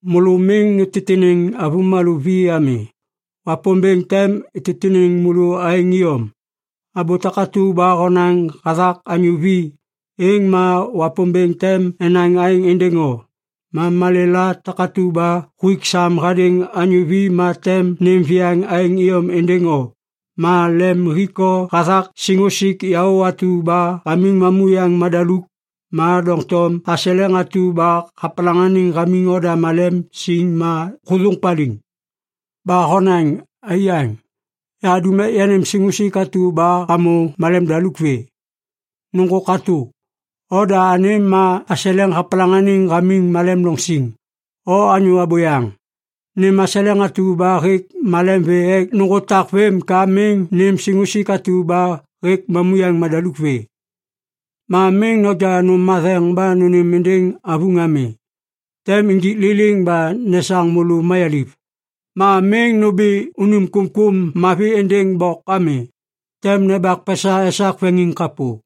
“Môlô miŋ nutitiniŋ anyô vi ami. Wapômbêŋ tem ititiniŋ môlô aêŋ iyom! Abô takatu ba honaŋ hathak anyô vi, êŋ ma Wapômbêŋ tem enaŋ aêŋ êndêŋ o. Ma malêla takatu ba huik sam hadêŋ anyô vi ma tem nêm viyaŋ aêŋ iyom êndêŋ o. Ma lem hik o hathak siŋusik yaô atu ba hamiŋ mamuyaŋ madaluk. Ma doŋtom aseleŋ atu ba hapalaŋaniŋ hamiŋ oda malem siŋ ma hôthôŋ paliŋ. Ba honaŋ, ‘Aiyaŋ, yahadum ek yanêm siŋusik atu ba hamô malem daluk vê.’ Nôŋgô katô, oda anêm ma aseleŋ hapalaŋaniŋ hamiŋ malem loŋ siŋ. O anyô abôyaŋ! Nêm aseleŋ atu ba hêk malem vê ek nôŋgô tak vêm ka miŋ nêm siŋusik atu ba hêk mamuyaŋ madaluk vê. “Ma miŋ noja nôm matheŋ ba nônêm êndêŋ avuŋ ami. Tem nijik liliŋ ba nesaŋ môlô mayaliv. Ma miŋ nômbi unim kômkôm mavi êndêŋ bok ami. Tem nembak pesa esak veŋiŋ kapô.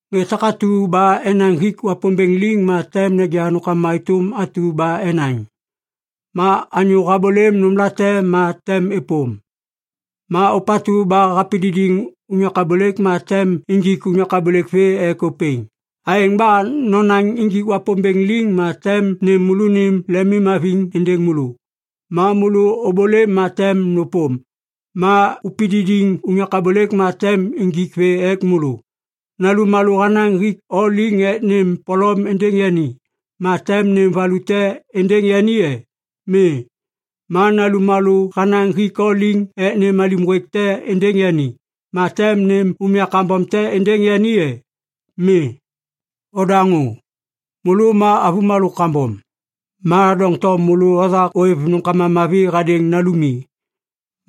“Ŋê takatu ba enaŋ hik Wapômbêŋ liŋ, ma tem neja nômkama êtôm atu ba enaŋ. Ma anyô habôlêm nômlate, êŋ ma tem êpôm. Ma ôpatu ba hapididiŋ unyak abôlêk, ma tem injik unyak abôlêk vê ek ôpêŋ. Aêŋ ba nonaŋ injik Wapômbêŋ liŋ ma tem nêm môlônim lemimhaviŋ êndêŋ môlô. Ma môlô ôbôlêm ma tem nôpôm. Ma upididiŋ unyak abôlêk ma tem injik vê ek môlô. “Nalummalô hanaŋ hik o liŋ ek nêm polom êndêŋ yani, ma tem nêm valu te êndêŋ yani e? Mi. Ma nalummalô hanaŋ hik o liŋ ek nêm alim ŋgwêk te êndêŋ yani, ma tem nêm umya kambom te êndêŋ yani e? Mi. Odaŋô! Môlô ma avômalô kambom! Ma doŋtom môlô othak ôêv nômkama mavi hadêŋ nalumi.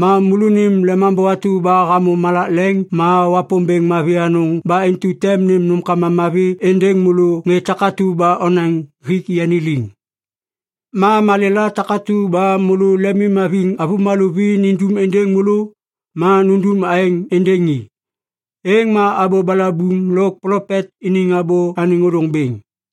Ma môlônim Lemambô atu ba hamô malak leŋ ma Wapômbêŋ mavi anôŋ ba intu tem nêm nômkama mavi êndêŋ môlô ŋê takatu ba onaŋ hik yani liŋ. “Ma malêla takatu ba môlô lemimhaviŋ avômalô vi nindum êndêŋ môlô, ma nundum aêŋ êndêŋ i. Êŋ ma abô balabuŋ lôk plopet iniŋ abô anêŋ ôdôŋ bêŋ.”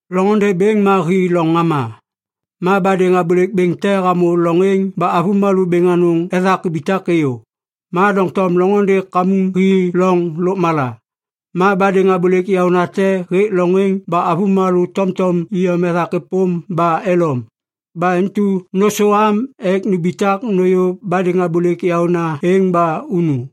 “Loŋôndê bêŋ ma hi loŋ ŋama. Ma badêŋ abôlêk bêŋ te hamô loŋ êŋ ba avômalô bêŋ anôŋ ethak ibitak êyô. Ma doŋtom loŋôndê kamuŋ hi loŋ lôkmala. Ma badêŋ abôlêk yaônate hêk loŋ êŋ ba avômalô tomtom iyom ethak êpôm ba elom. Ba intu nôsôam ek numbitak nôyô badêŋ abôlêk yaôna êŋ ba unu.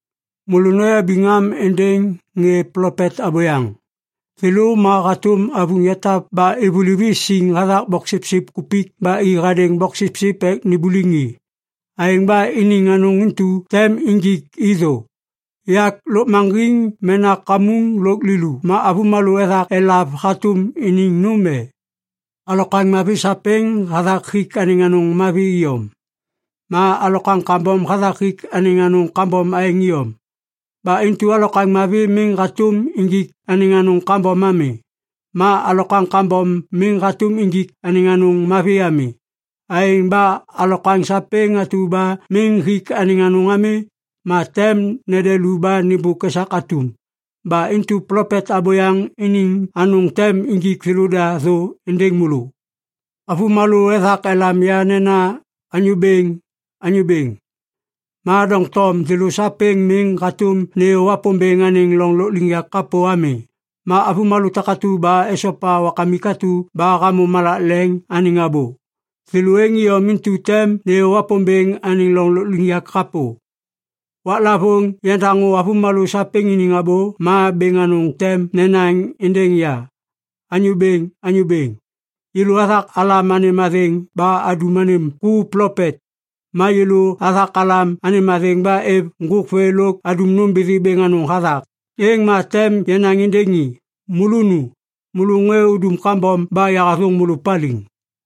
“Môlô noyabiŋ am êndêŋ ŋê plopet abôyaŋ. Thêlô ma hatôm avuŋ yatap ba ivuliv i siŋ hathak boksipsip kupik ba i hadêŋ boksipsip ek nimbuliŋ i. Aêŋ ba iniŋ anôŋ intu tem injik i thô. Yak lôkmaŋgiŋ mena kamuŋ lôk lilu ma avômalô ethak elav hatôm iniŋ nôm e? Alokwaŋ mavi sapêŋ hathak hik anêŋ anôŋ mavi iyom. Ma alokwaŋ kambom hathak hik anêŋ anôŋ kambom aêŋ iyom. Ba intu alokwaŋ mavi miŋ hatôm injik anêŋ anôŋ kambom ami. Ma alokwaŋ kambom miŋ hatôm injik anêŋ anôŋ mavi ami. Aêŋ ba alokwaŋ sapêŋ atu ba miŋ hik anêŋ anôŋ ami, ma tem nede lu ba nêmbôk esak atum. Ba intu plopet abôyaŋ iniŋ anôŋ tem injik thêlôda thô êndêŋ môlô. “Avômalô ethak elam ya nena, ‘Anyô Bêŋ, Anyô Bêŋ.’ Ma doŋtom thêlô sapêŋ miŋ hatôm nêyô Wapômbêŋ anêŋ loŋ lôkliŋyak kapô ami. Ma avômalô takatu ba esopa Wakamik atu ba hamô malak leŋ anêŋ abô, thêlô êŋ iyom intu tem nêyô Wapômbêŋ anêŋ loŋ lôkliŋyak kapô. Waklavôŋ yandaŋô avômalô sapêŋ iniŋ abô, ma bêŋ anôŋ tem nenaŋ êndêŋ ya ‘Anyô Bêŋ, Anyô Bêŋ, yêlô athak alam anêm athêŋ ba adum anêm ku plopet. Ma yêlô athak alam anêm athêŋ ba êv ŋgôk vê lôk adum nômbithi bêŋ anôŋ hathak.’ Êŋ ma tem yanaŋ êndêŋ i, ‘Môlô nu! Môlô ŋê udum kambom ba yahathôŋ môlô paliŋ.’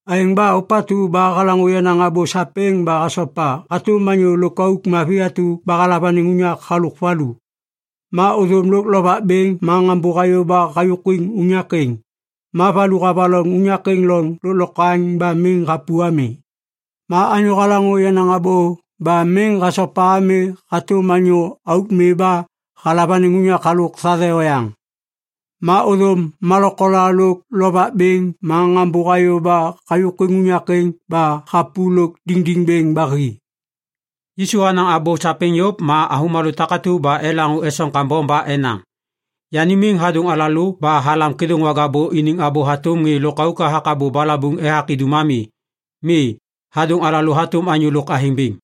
“Aêŋ ba ôpatu ba halaŋô yenaŋ abô sapêŋ ba hasopa hatôm anyô lôkauk mavi atu ba halav anêŋ unyak halôk valu. Ma ôthôm lôk lovak bêŋ ma ŋambô hayô ba hayôkwiŋ unyak êŋ. Ma valu havaloŋ unyak êŋ loŋ lôklokwaŋ ba miŋ hapu ami. Ma anyô halaŋô yenaŋ abô ba miŋ hasopa ami hatôm anyô auk mi ba halav anêŋ unyak halôk thathe oyaŋ. Ma ôthôm malokola lôk lovak bêŋ ma ŋambô hayô ba hayôkwiŋ unyak êŋ ba hapu lôk diŋdiŋ bêŋ ba hi.” Yisu hanaŋ abô sapêŋ yôv ma avômalô takatu ba elaŋô esoŋ kambom ba enaŋ, “Yani miŋ hadôŋ alalô ba halam kêdôŋwaga bô iniŋ abô hatôm ŋê lôkauk hathak abô balabuŋ ethak idum ami. Mi. Hadôŋ alalô hatôm anyô lôk athêŋ bêŋ.”